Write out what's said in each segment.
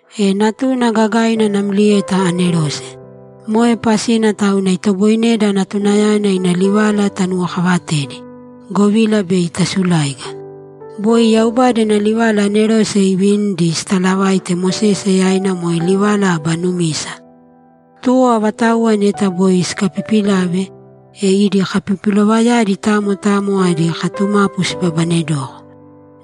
E Natuna gagaina namlieta anerose. Moe pasina tauna itoboineda Natunayana ina livala tanuwokavatedi, govila bei tasuláiga. Boi Yaubada ina livala anerose iivinidi sitalavaite Mosese yaina moe livala aba numisa. Tuwo avatauwa neta boi sikapipilave, e idi kapipilovayadi tamo tamo adi katumapu sibabanedoko.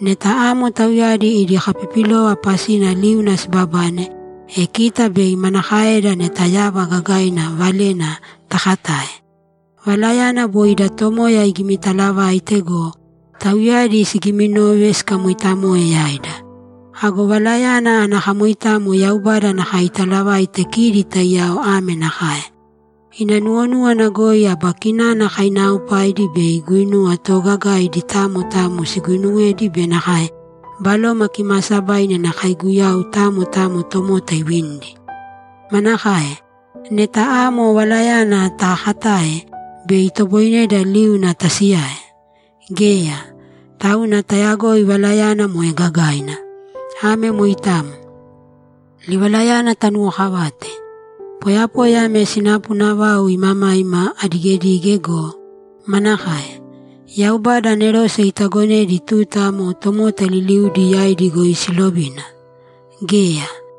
Neta amo tauyadi idi kapipilova pasina liuna sibabane, e kita bei manakaeda neta yava gagaina valena takatae? Valayana boi ida Tomoya igimitalavaite go, tauyadi sigiiminove sikamoitamoe yaida. Ago valayana ana kamoitamo Yaubada nakae italavaite kidi taiyao ame nakae: Ina nuwonúwana goi aba kinana kainaaopaidi be guinuwa toogagaidi tamo tamo siguinuwedi be nakae Baloma Kimaasabaina ina kaiguyau tamo tamo tomota iivinidi. Manakae? Neta amo valayana taakatae, bei itoboineda liuna tasiyae? Geya! Tauna tayagoi valayana moe gagaina. Ame moitamo. Livalayana tanuwokavāte. Poyapoya ame sinapuna vau imamaima adigedige go, manakae? Yaubada anerose itagonedi tuta amo tomota liliudi yaidi goi siilovina? Geya!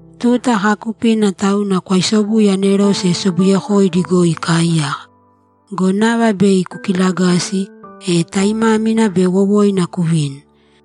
Tuta kaakupina tauna kwaisobuye anerose sobuyekoidi goi ikaaiyaka. Go nava bei kukilagasi, e taimámina be wowoina kuvini.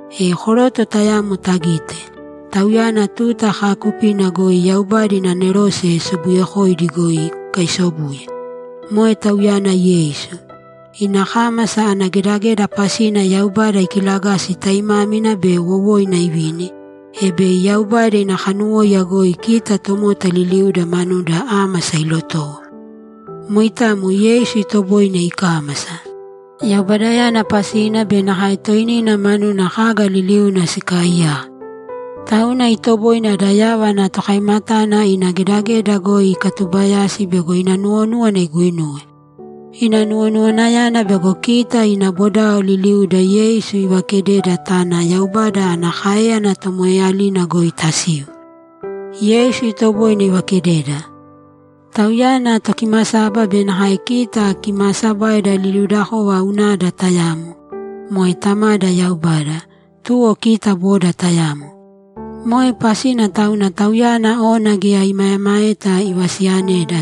E koroto tayamo tagite, Tauyana tuta kaakupina goi Yaubada ina anerose sobuyekoidi goi ikaisobuye. Moe Tauyana Yeisu. Ina kámasa ana gedageda pasina Yaubada ikilagasi taimámina be wowoina ivini, e bei Yaubada ina kanuwóiya goi kita tomota liliuda manuda ámasa ilotowo. Moitamo Yeisu itoboine ikámasa. Yaubadayana pasina be nakae toinina manuna kaga liliuna sikaaiyaka. Tauna itoboine ada yava ana Tokaimatana ina gedageda goi ikatubayasi bego ina nuwonúwana iguinuwe. Ina nuwonuwanayana bego kita ina bodao liliuda Yeisu ivakededa tana Yaubada ana káeyana tomoeeyalina goi tasiu. Yeisu itoboine ivakededa. Tauyana Tokimasaba be nakae kita kimaasabaida liliudakova unada tayamo, moe Tamada Yaubada, tuwo kita boda tayamo. Moe pasina tauna Tauyana ona geya imaemaeta ivasiyaneda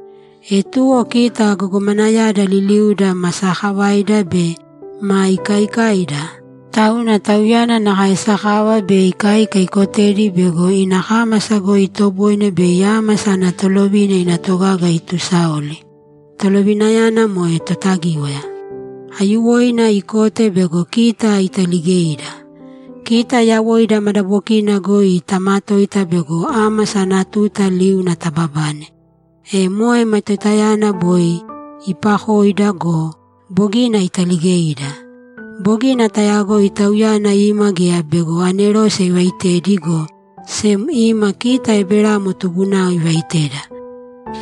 E tuwo kita gogomanayada liliuda ma sakavaida be ma ikaikaida, tauna Tauyana nakae sakava be ikaika ikotedi bego ina kámasa goi itoboine bei ámasa ana tolovina ina togaga itusaoli; tolovinayana moe Totagíwaya. Aiyuwoina ikote bego kita italigeida. Kita yawoida madabokina goi tamatoita bego ámasa ana tuta liuna tababane, e moe matoitayana boi iipakoida go, bogina italigeida. Bogina tayagoi Tauyana ima geya bego anerose ivaitedi, go sem ima kita Eberamo tubunao ivaiteda.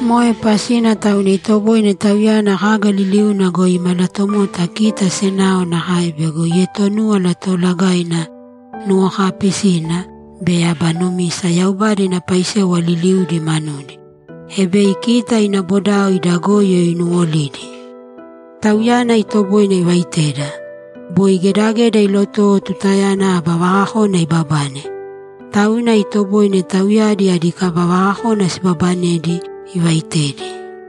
Moe pasina tauna itoboine Tauyana kaga liliuna goi imalatomota kita senao nakae bego ietonúwala toolagaina nuwokaapisina be aba numisa Yaubada ina paisewa liliudi manudi, e bei kita ina bodao ida goyo inuwolidi. Tauyana itoboine ivaiteda. Boi gedageda ilotowo tutayana aba vakakona ibabane. Tauna itoboine tauyadi adi kaba vakakona sibaabanedi ivaitedi.